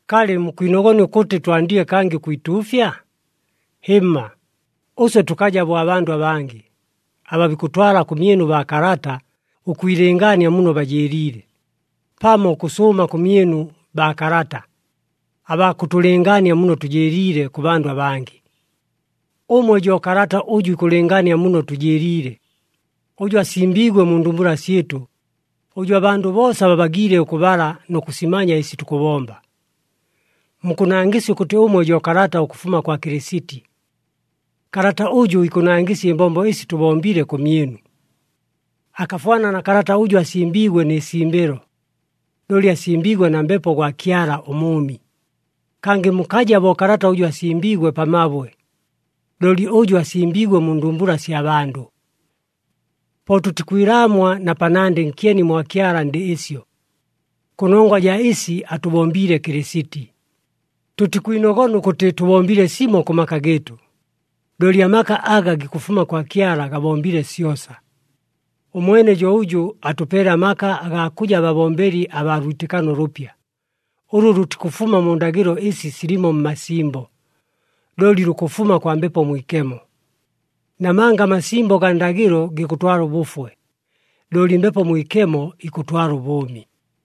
Kalɨ mukwinogona ʉkʉtɨ twandile kangɨ ʉkwituufya? Hɨmma, ʉswe tʉkaja bo abandʉ abangɨ, aba bikʉtwala kʉmyɨnu baakalata, ʉkwilɨngaania muno bajɨɨliile, pamo ʉkʉsʉʉma kʉmyɨnu baakalata, abaa kʉtʉlɨngaania muno tʉjɨɨliile kʉ bandʉ abangɨ. Ʉmwe jo kalata ʉjʉ ikʉlɨngaania muno tʉjɨɨliile, ʉjʉ asimbiigwe mu ndumbula syɨtʉ, ʉjʉ abandʉ boosa babagiile ʉkʉbala nʉ kʉsimanya ɨsi tukʉbomba. Mukʉnangɨsya ʉkʉtɨ ʉmwe jo kalata ʉkʉfuma kwa Kɨlɨsiti. Kalata ʉjʉ ikʉnangɨsya ɨmbombo ɨsi tʉbombile kʉmyɨnu. Akafwana na kalata ʉjʉ asimbiigwe nɨ simbɨlo, looli asimbiigwe na Mbepo gwa Kyala ʉMʉʉmi. Kangɨ mukaja bo kalata ʉjʉ asimbiigwe pa mabwe, looli ʉjʉ asimbiigwe mu ndumbula sya bandʉ. Po tʉtikwilaamwa na panandɨ nkyeni mwa Kyala ndɨ ɨsyo, kʉnongwa jaa ɨsi atʉbombiile Kɨlɨsiti. Tʉtikwinogona ʉkʉtɨ tʉbombile simo kʉ maka gɨɨtʉ, looli amaka aga gikʉfuma kwa Kyala gabombile syosa. Ʉmwene jo ʉjʉ atʉpeele amaka agaa kʉja babombeli abaa lwitɨkano ʉlʉpya, ʉlʉ lʉtikʉfuma mu ndagɨlo ɨsi silimo mmasimbo, looli lukʉfuma kwa Mbepo Mwikemo. Namanga amasimbo gaa ndagɨlo gikʉtwala ʉbʉfwe, looli Mbepo Mwikemo ikʉtwala ʉbʉʉmi.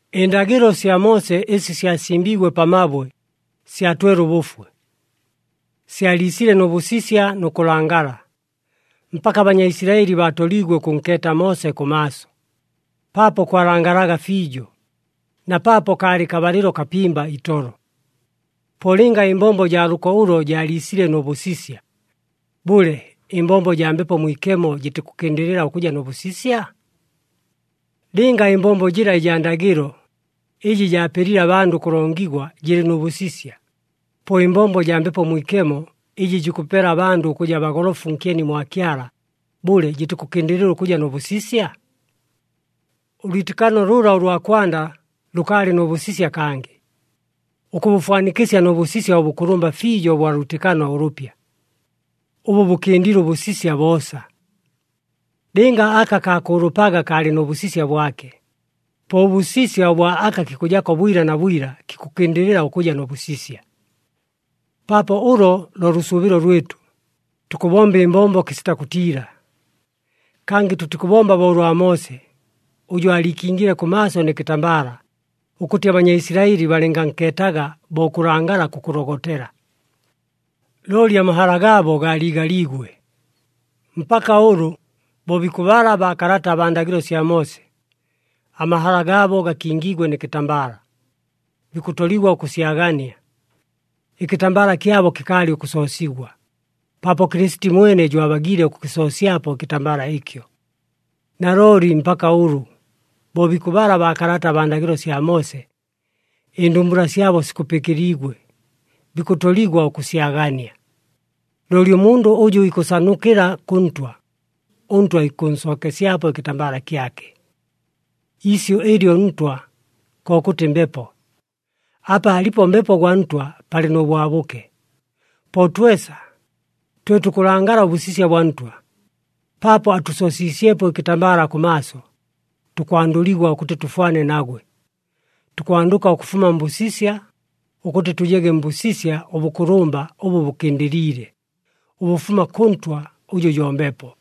Ɨndagɨlo sya Moose ɨsi syasimbiigwe pa mabwe, syatwele ʉbʉfwe. Syaliisile nʉ bʉsisya nʉ kʉlangala, mpaka aBanyaisilaɨli baatoliigwe ʉkʉnkeeta Moose kʉmaaso, paapo kwalangalaga fiijo, na paapo kaalɨ kabalɨlo kapimba itolo. Po lɨnga ɨmbombo jaa lʉko ʉlo jaaliisile nʉ bʉsisya, bʉle, ɨmbombo jaa Mbepo Mwikemo jɨtikʉkɨndɨlɨla ʉkʉja nʉ bʉsisya? Lɨnga ɨmbombo jɨla ɨjaa ndagɨlo, ɨjɨ jaapelile abandʉ ʉkʉlongigwa jɨlɨ nʉ bʉsisya, po ɨmbombo jaa Mbepo Mwikemo, ɨjɨ jikʉpela abandʉ ʉkʉja bagolofu nkyeni mwa Kyala, bʉle jɨtikʉkɨndɨlɨla ʉkʉja nʉ bʉsisya? Ʉlwitɨkano lʉla ʉlwa kwanda lʉkaalɨ nʉ bʉsisya kangɨ, ʉkʉbʉfwanikɨsya nʉ bʉsisya ʉbʉkʉlʉmba fiijo ʉbwa lwitɨkano ʉlʉpya, ʉbʉ bʉkɨndile ʉbʉsisya boosa. Lɨnga aka kaakʉʉlʉpaga kaalɨ nʉ bʉsisya bwake, po ʉbʉsisya bwa aka kikʉjako bwila na bwila kikʉkɨndɨlɨla ʉkʉja nʉ bʉsisya. Paapo ʉlo lo lʉsʉʉbɨlo lwɨtʉ, tukʉbomba ɨmbombo kɨsita kʉtiila. Kangɨ tʉtikʉbomba bo ʉlwa Moose, ʉjʉ aaliikingile kʉmaaso nɨ kɨtambala, ʉkʉtɨ aBanyaisilaɨli balɨngankeetaga bo ʉkʉlangala kukʉlogotela. Looli amahala gaabo gaaliigaliigwe. Mpaka ʉlʉ, bo bikʉbala baakalata abaa ndagɨlo sya Moose, amahala gaabo gakingiigwe nɨ kɨtambala, bikʉtoligwa ʉkʉsyagania. Ɨkɨtambala kyabo kɨkaalɨ ʉkʉsoosigwa, paapo Kɨlɨsiti mwene jo abagiile ʉkʉkɨsoosyapo ɨkɨtambala ɨkyo. Nalooli mpaka ʉlʉ, bo bikʉbala baakalata abaa ndagɨlo sya Moose, ɨndumbula syabo sikupɨkɨliigwe, bikʉtoligwa ʉkʉsyagania. Looli ʉmundʉ ʉjʉ ikʉsanukɨla kʉ Ntwa, ʉNtwa ikʉnsookesyapo ɨkɨtambala kyake. Iisyʉ ɨlyo, “Ntwa,” kokʉtɨ, “Mbepo.” Apa alipo Mbepo gwa Ntwa palɨ nʉ bwabʉke. Po twesa, twe tukʉlangala ʉbʉsisya bwa Ntwa, paapo atʉsoosiisyepo ɨkɨtambala kʉmaaso, tukwandʉligwa ʉkʉtɨ tʉfwane nagwe. Tukwandʉka ʉkʉfuma mbʉsisya, ʉkʉtɨ tʉjege mbʉsisya ʉbʉkʉlʉmba ʉbʉ bʉkɨndɨliile, ʉbʉfuma kʉ Ntwa, ʉjʉ jo Mbepo.